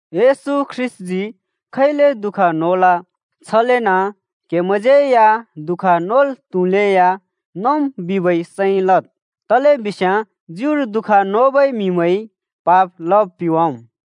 येशू ख्रीष्‍टजी खैले दुःख नोल, छलेन क्‍हेमैंज्‍यै या दुःख नोल् त्हुलेया नोम् बिबै सैं लद्। तलेबिस्याँ ज्युर दुःख नोबै म्हिमैंइ पाप लब पिवाम्।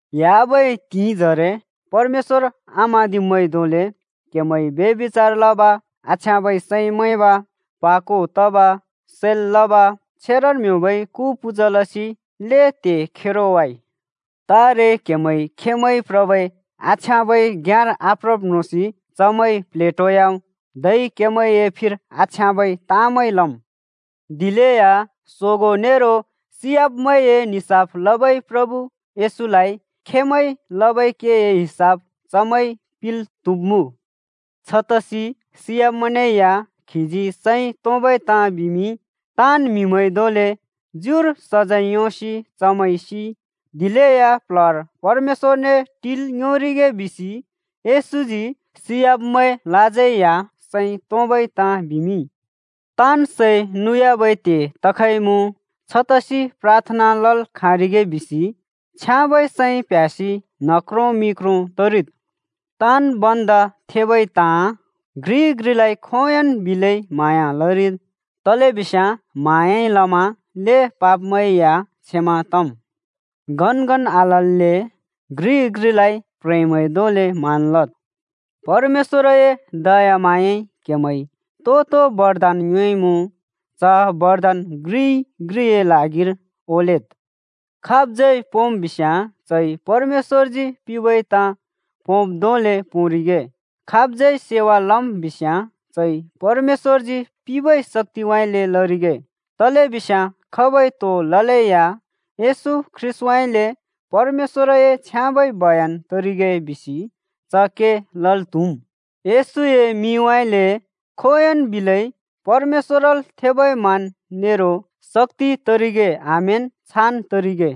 ह्‍याबै त्हिंइजरे परमेश्‍वर आम्हाँदिब्मैंइ धोंले क्हेमैंइ ब्यभिचार लब, आछ्याँबै सैं मैंब, प्हा को तब, सैल् लब, छेरन् ब्योंबै कु पूजा लसि ल्हें त्हे खेरो वाइ। तारे क्‍हेमैं खेंमैं प्रबै आछ्याँबै घ्‍याँर आप्रब् म्रोंसि चमैं प्लेटोयाम्, धै क्‍हेमैंए फिर आछ्याँबै ताँमैं लम्। दिलेया सोगों नेरो सियाब्मैंए निसाफ लबै प्रभु येशूलाइ खेंमैंइ लबै केए हिसाब चमैंइ पिंल् त्‍हुब्‍मुँ। छतसि सियाब्‍मैंनेया खीजी सैं तोंबै ताँ बिमिंइ। ताँन् म्हिमैं धोंले ज्युर सजैं योंसि चमैं सिइ, दिलेया प्‍ल्‍हर परमेश्‍वरने टिल् योंरिगे बिसि येशूजी सियाब्मैंलाज्यै या सैं तोंबै ताँ बिमिंइ। ताँन् सै नुयाबै त्हे तखइमुँ। छतसि प्राथना लल् खाँरिगे बिसि छ्याँबै सैं प्ह्‍यासि न्ह क्रों मि क्रों तरिद्। ताँन् भन्दा थेबै ताँ: घ्रिइ घ्रिलाइ खोंयोंन् बिलै म्हाँया लरिद्, तलेबिस्याँ म्हाँयाइ लमा ल्‍हें पापमैं या क्षमा तम्। गनगन आलल्‍ले घ्रिइ घ्रिलाइ प्ह्रेंमैं धोंले मान लद्। परमेश्‍वरए दयाम्हाँयाइ क्हेमैंइ तो-तो बरदान योंइमुँ, च बरदान घ्रिइ घ्रिए ल्हागिर ओलेद्। खाबज्यै पोंम् बिस्याँ, चइ परमेश्‍वरजी पिंबै ताँ पोंब् धोंले पोंरिगे। खाबज्यै सेवा लम् बिस्याँ चइ परमेश्‍वरजी पिंबै शक्‍तिउँइँले लरिगे, तलेबिस्याँ खाबइ तो ललेया येशू ख्रीष्‍टउँइँले परमेश्‍वरलए छ्याँबै बयान तरिगे बिसि च के लल् त्हुम्। येशूए मिंउँइँले खोंयोंन् बिलै परमेश्‍वरल थेबै मान नेरो शक्‍ति तरिगे आमेन, छान् तरिगे।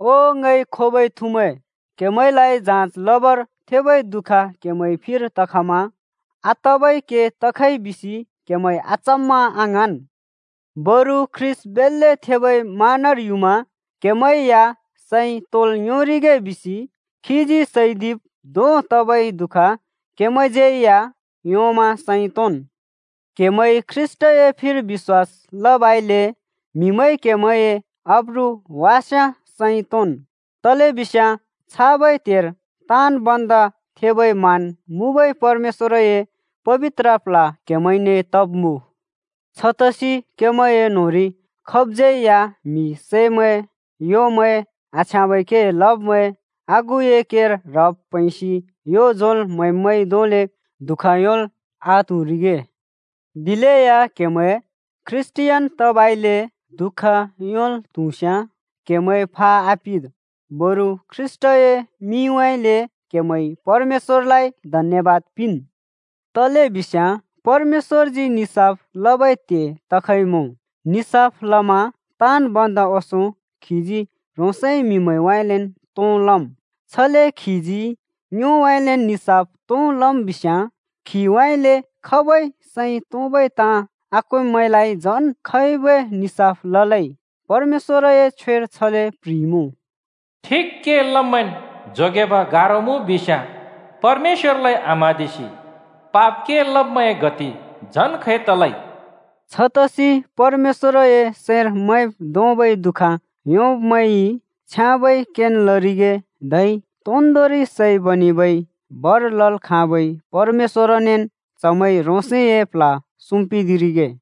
ओ ङइ खोबै थुमैं, क्‍हेमैंलाइ जाँज लबर थेबै दुःख क्‍हेमैं फिर तखमा आतबै के तखइ बिसि क्हेमैं अचम्‍मा आङ्हाँन्। बरु ख्रीष्‍ट बेल्‍ले थेबै मानर युमा क्हेमैं या सैं तोंल् योंरिगे बिसि खीजी सैदिब् धों तबै दुःख क्‍हेमैंज्यै या योंमा सैं तोंन्। क्‍हेमैंइ ख्रीष्‍टए फिर बिश्‍वास लबइले म्‍हिमैंइ क्‍हेमैंए आब्रु वास्‍याँ सैं तोंन्, तलेबिस्याँ छाबै त्हेर ताँन् भन्दा थेबै मान मुँबै परमेश्‍वरए पबित्र प्ल्ह क्‍हेमैंने तब्मुँ। छतसि क्‍हेमैंए न्होंरि खाबज्यै या म्हि सैमैं, ह्‍‍योमैं आछ्याँबै के लब्मैं, आगुए केर ह्रब् प्हैंसि यो झोंल् म्हैब्मैंइ धोंले दुःख योंल् आत्हुरिगे। दिलेया क्‍हेमैं ख्रीष्‍टियान तबइले दुःख योंल् त्‍हुस्‍याँ क्‍हेमैं फा आपिद्, बरु ख्रीष्‍टए मिंउँइँले क्हेमैंइ परमेश्‍वरलाइ धन्‍यबाद पिंन्। तलेबिस्याँ परमेश्‍वरजी निसाफ लबै त्हे तखइमुँ। निसाफ लमा ताँन् भन्दा ओंसों खीजी ह्रोंसए म्‍हिमैंउँइँलेन् तों लम्। छले खीजी ङ्योउँइँलेन् निसाफ तों लम् बिस्याँ, खीउँइँले खबै सैं तोंबै ताँ आक्वेंब्‍मैंलाइ झन खैबै निसाफ ललै? परमेश्‍वरए छ्वेर छले प्ह्रिइमुँ: “ठिक के लब्मैंन् जोगेब गारो मुँ बिस्याँ परमेश्‍वरलाइ आम्‍हाँदिबै पाप लब्‍मैंए गति झन् खै तलै?” छतसि परमेश्‍वरए सैंर मैंब् धोंबै दु:ख योंब्मैंइ छ्याँबै केन् लरिगे, धै तोन्दोंरि सै बनेबै भर लल् खाँबै परमेश्‍वरनेन् चमैंइ ह्रोंसए प्ल्ह सुम्पिदिरिगे।